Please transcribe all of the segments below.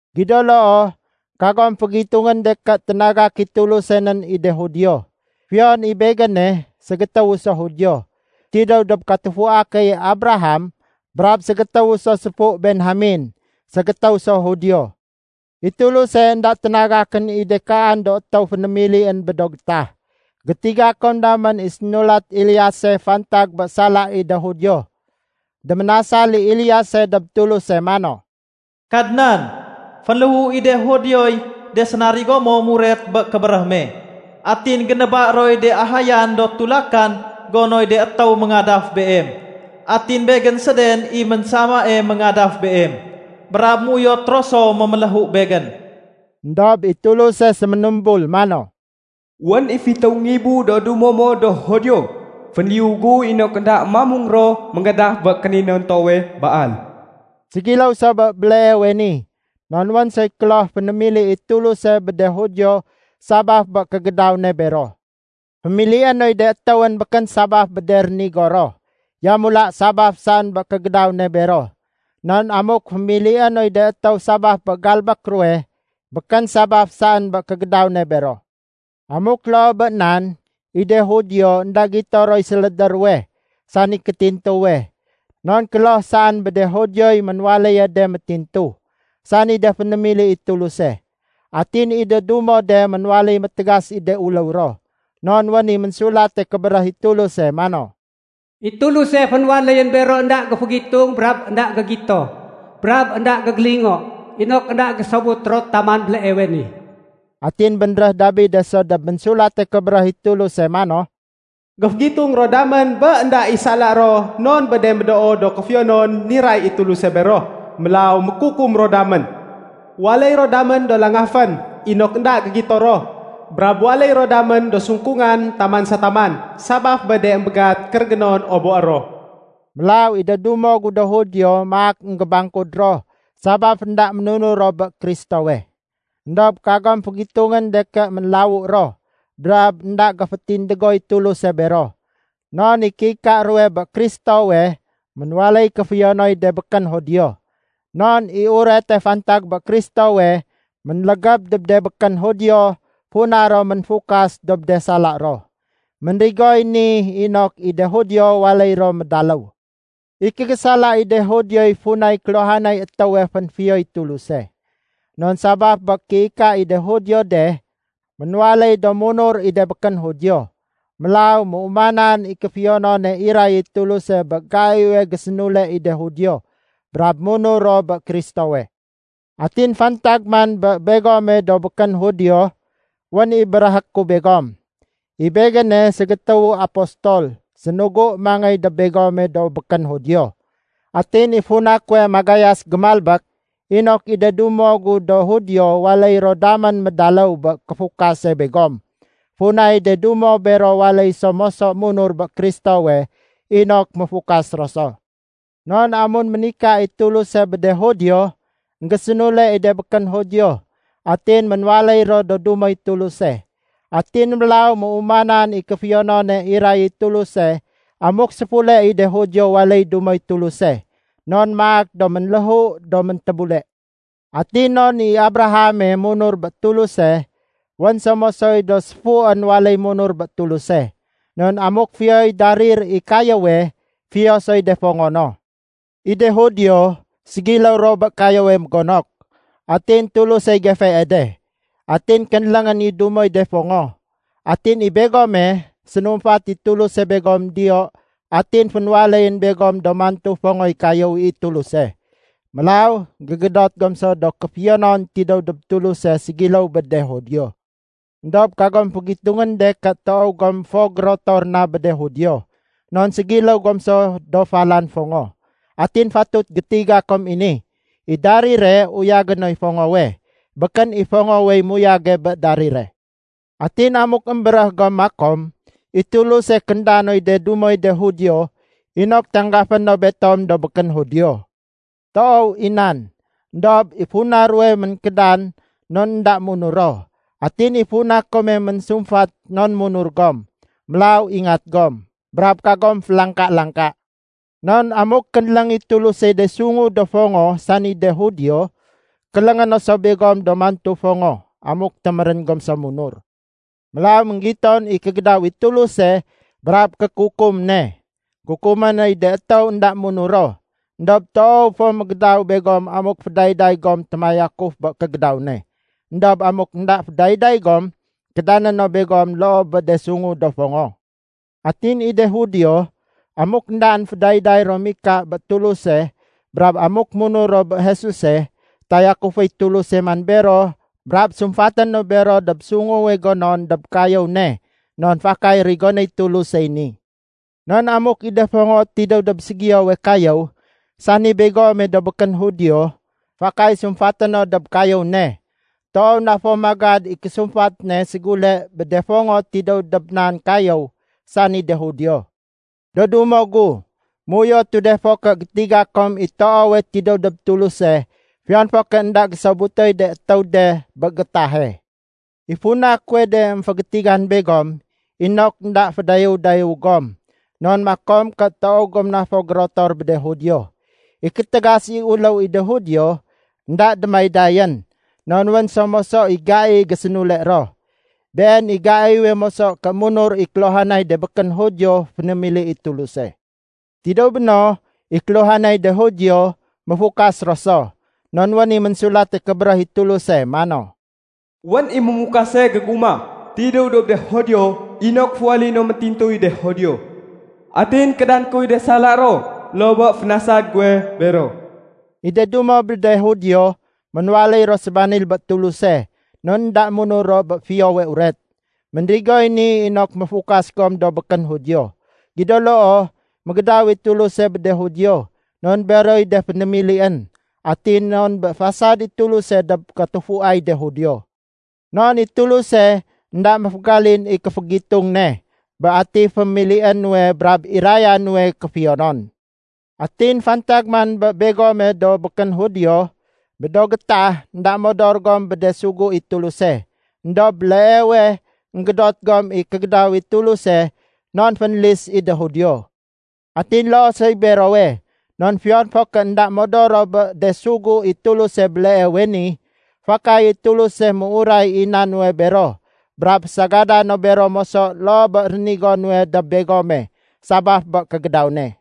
Gido loo, kagom fégitungén de ké ténagak i Tuluse nén i de Judio. Fiyon i begéne, ségétéwu so Judio tidéw dob katufua keye Abraham brab ségétéwu so séfu Benjamen, ségétéw so Judio. I Tuluse énda ténagakén i de kaan do étéw fénémilién bé do getah. Gétiga kom damén i sénulat Eliase fantag bé sala i de Judio. Déménasal i Eliase dob Tuluse mano, “Kadnan, fénléhu i de Judioy de sénarigo mo muret bé kébéréh me. Atin généba roy de ahayan do tulakan gonoy de étéw méngadaf Beem. Atin begén séden i ménsamae méngadaf Beem, brab méuyot ro so méméléhu begén.” Endob i Tuluse séménumbul mano, “Wén i fitéw ngibu do dumo mo do Judio fénliyu gu inok énda mamung ro méngadaf bé kéninontowe Baal.” Ségiléw so bé béleewe ni, non wén soy kloh fénémili i Tuluse bé de Judio sabaf bé kégédaw ne bero. Fémilié noy de étéwén békén sabaf bé de rénigo ro, yamula sabaf saén bé kégédaw ne bero. Non amuk fémilié noy de étéw sabaf bé galbék ruwe, békén sabaf saén bé kégédaw ne bero. Amuk loo bé nan, i de Judio énda gito roy sélédé ruwe, sani kétintuwe. Non kloh saén bé de Judioy ménwaléye de métintu, sani de fénémili i Tuluse. Atin i de dumo de ménwaléy métégas i de uléw ro. Non wén i Ménsulate Kébéréh i Tuluse mano, “I Tuluse fénwaléyén bero énda géfégitung brab énda gégito brab énda gégélingo inok énda gésobut ro taman béleewe ni.” Atin bénréh Dabide so dob Ménsulate Kébéréh i Tuluse mano, “Géfégitung ro damén bé énda i sala ro non bé de médoo do kéfiyonon niray i Tuluse bero. Mélaw mékukum ro damén. Waléy ro damén do langafén, inok énda gégito ro. Brab waléy ro damén do sungkungan taman sa taman sabaf bé de émbégat kérégénon oboé ro.” Mélaw i de dumo gu do Judio maak énggébangkud ro sabaf énda ménunur ro bé Kristowe. Endob kagom fégitungén de ké ménlawu ro brab énda géfétindégoy Tuluse bero. Non i kéika ruwe bé Kristowe, ménwaléy kéfiyonoy de békén Judio. Non i urete fantag bé Kristowe ménlégéb dob de békén Judio funa ro ménfukas dob de sala ro. Ménrigoy ni inok i de Judio waléy ro médaléw. I kégésala i de Judioy funay kéluhanay étéwe fénfiyoy Tuluse. Non sabaf bé kéika i de Judio de, ménwaléy do munur i de békén Judio. Mélaw méumanan i kéfiyonone iray i Tuluse bé gaiwe gésénule i de Judio brab munur ro bé Kristowe. Atin fantag man bé begome do békén Judio, wén i béréhé ku begom. I begéne ségétéwu apostol sénugu mangéy dob begome do békén Judio. Atin i funa kuwe magayas gémalbék, inok i de dumo gu do Judio waléy ro damén médaléw bé kéfukase begom funay de dumo bero waléy so moso munur bé Kristowe inok méfukas ro so. Non amun ménika i Tuluse bé de Judio, énggésénule i de békén Judio atin ménwaléy ro do dumoy Tuluse. Atin mélaw méumanan i kéfiyonone iray i Tuluse amuk séfule i de Judio waléy dumoy Tuluse, non maak do ménléhu do méntébule. Atin non i Abrahame munur bé Tuluse, wén so mosoy do séfuén waléy munur bé Tuluse. Non amuk fiyoy darir i kayéwe, fiyo soy de fongo no. I de Judio ségiléw ro bé kayéwe mégonok. Atin Tulusey gefee de. Atin kénléngén i dumoy de fongo. Atin i begome, sénumfat i Tuluse begom diyo atin fénwaléyén begom do mantu fongoy kayéw i Tuluse. Mélaw gégédot gom so do kéfiyonon tidéw dob Tuluse ségiléw bé de Judio. Endob kagom fégitungén de ké toow gom fo gérotor na bé de Judio. Non ségiléw gom so do falan fongo. Atin fatut gétiga kom i ni, i darire uyagé noy fongowe, békén i fongowey muyage bé darire. Atin amuk émbéréh gom makom, “I Tuluse kénda noy de dumoy de Judio inok tanggafé no betom do békén Judio.” Toow i nan. Endob i funa ruwe ménkédan non énda munur ro. Atin i funa kome ménsumfat non munur gom. Mélaw ingat gom, brab kagom félangka-langka. Non amuk kénléng i Tulusey de sungu do fongo sani de Judio, kéléngé no so begom do mantu fongo amuk témérén gom so munur. Mélaw énggiton i kégédaw i Tuluse brab kékukum ne. Kukumé noy de étéw énda munur ro. Endob toow fo mégédaw begom amuk fédayday gom témayakuf bé kégédaw ne. Endob amuk énda fédayday gom, kédané no begom loo bé de sungu do fongo. Atin i de Judio, amuk éndaén fédayday ro mika bé Tuluse brab amuk munur ro bé Jesuse, tayakuféy Tuluse man bero brab sumfaté no bero dob sunguwe gonon dob kayéw ne non fakay rigonéy Tulusey ni. Non amuk i de fongo tidéw dob ségiyowe kayéw, sani begome do békén Judio, fakay sumfaté no dob kayéw ne, toow na fo magad i késumfat ne ségule bé de fongo tidéw dob nan kayéw, sani de Judio. Do dumo gu, méuyotu de fo ké gétiga kom i toowe tidéw dob Tuluse fiyon fo ké énda gésobutoy de étéw de bé gétahe. I funa kuwe de émfégétigan begom inok énda fédayéw-dayéw gom non makom ké toow gom na fo gérotor bé de Judio. I kétégas i uléw i de Judio, énda démaydayén. Non wén so moso i gai gésénule ro. Been i gaiwe moso ké munur i kéluhanay de békén Judio fénémili i Tuluse. Tidéw béno, i kéluhanay de Judio méfukas ro so. Non wén i Ménsulate Kébéréh i Tuluse mano, “Wén i mémukase gégumah tidéw dob de Judio inok féwaléyé no métintuy de Judio. Atin kédané kuy de sala ro loo bé fénasad guwe bero.” I de dumo bé de Judio ménwaléy ro sébanil bé Tuluse non énda munur ro bé Fiyowe Uret. Ménrigoy ni inok méfukas gom do békén Judio. Gido loo, mégédaw i Tuluse bé de Judio non beroy de fénémilién, atin non bé fasad i Tuluse dob katufuay de Judio. Non i Tuluse énda méfégalin i kéfégitung ne bé atiy fémilié nuwe brab iraya nuwe kéfiyonon. Atin fantag man bé begome do békén Judio, bé do gétah énda modor gom bé de sugu i Tuluse. Endob béleewe énggédot gom i kégédaw i Tuluse non fénlis i de Judio. Atin loo soy berowe, non fiyon fo ké énda modor ro bé de sugu i Tuluse béleewe ni, fakay i Tuluse méuray i na nuwe bero brab fésagadé no bero moso loo bé rénigo nuwe dob begome sabaf bé kégédaw ne.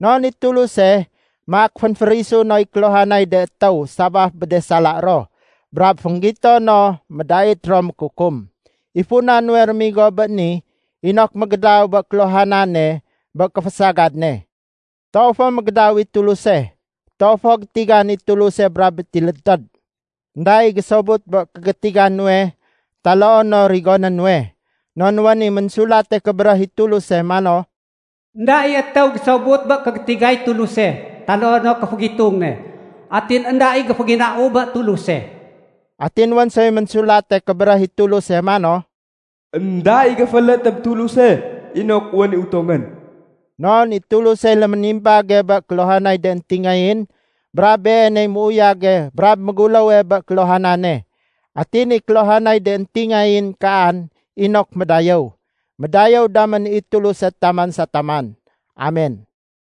Non i Tuluse, maak fénférisu noy kéluhanay de étéw sabaf bé de sala ro brab fénggito no médait ro mékukum. I funa nuwe réménigo bé ni inok mégédaw bé kéluhanane bé kéfésagad ne. Toow fo mégédaw i Tuluse! Toow fo gétigan i Tuluse brab métilédtéd! Enda i gésobut bé kégétiga nuwe taloo no rigoné nuwe. Non wén i Ménsulate Kébéréh i Tuluse mano, “Enda i étéw gésobut bé kégétigay Tuluse taloo no kéfégitung ne. Atin énda i géféginau bé Tuluse.” Atin wén soy Ménsulate Kébéréh i Tuluse mano, “Enda i géféélét dob Tuluse inok wén i utongén.” Non i Tulusey léménimbage bé kéluhanay de éntingayén, brab Beeney muyage brab méguléwe bé kéluhanane. Atin i kéluhanay de éntingayén kaan inok médayéw. Médayéw damén i Tuluse taman sa taman. Amen.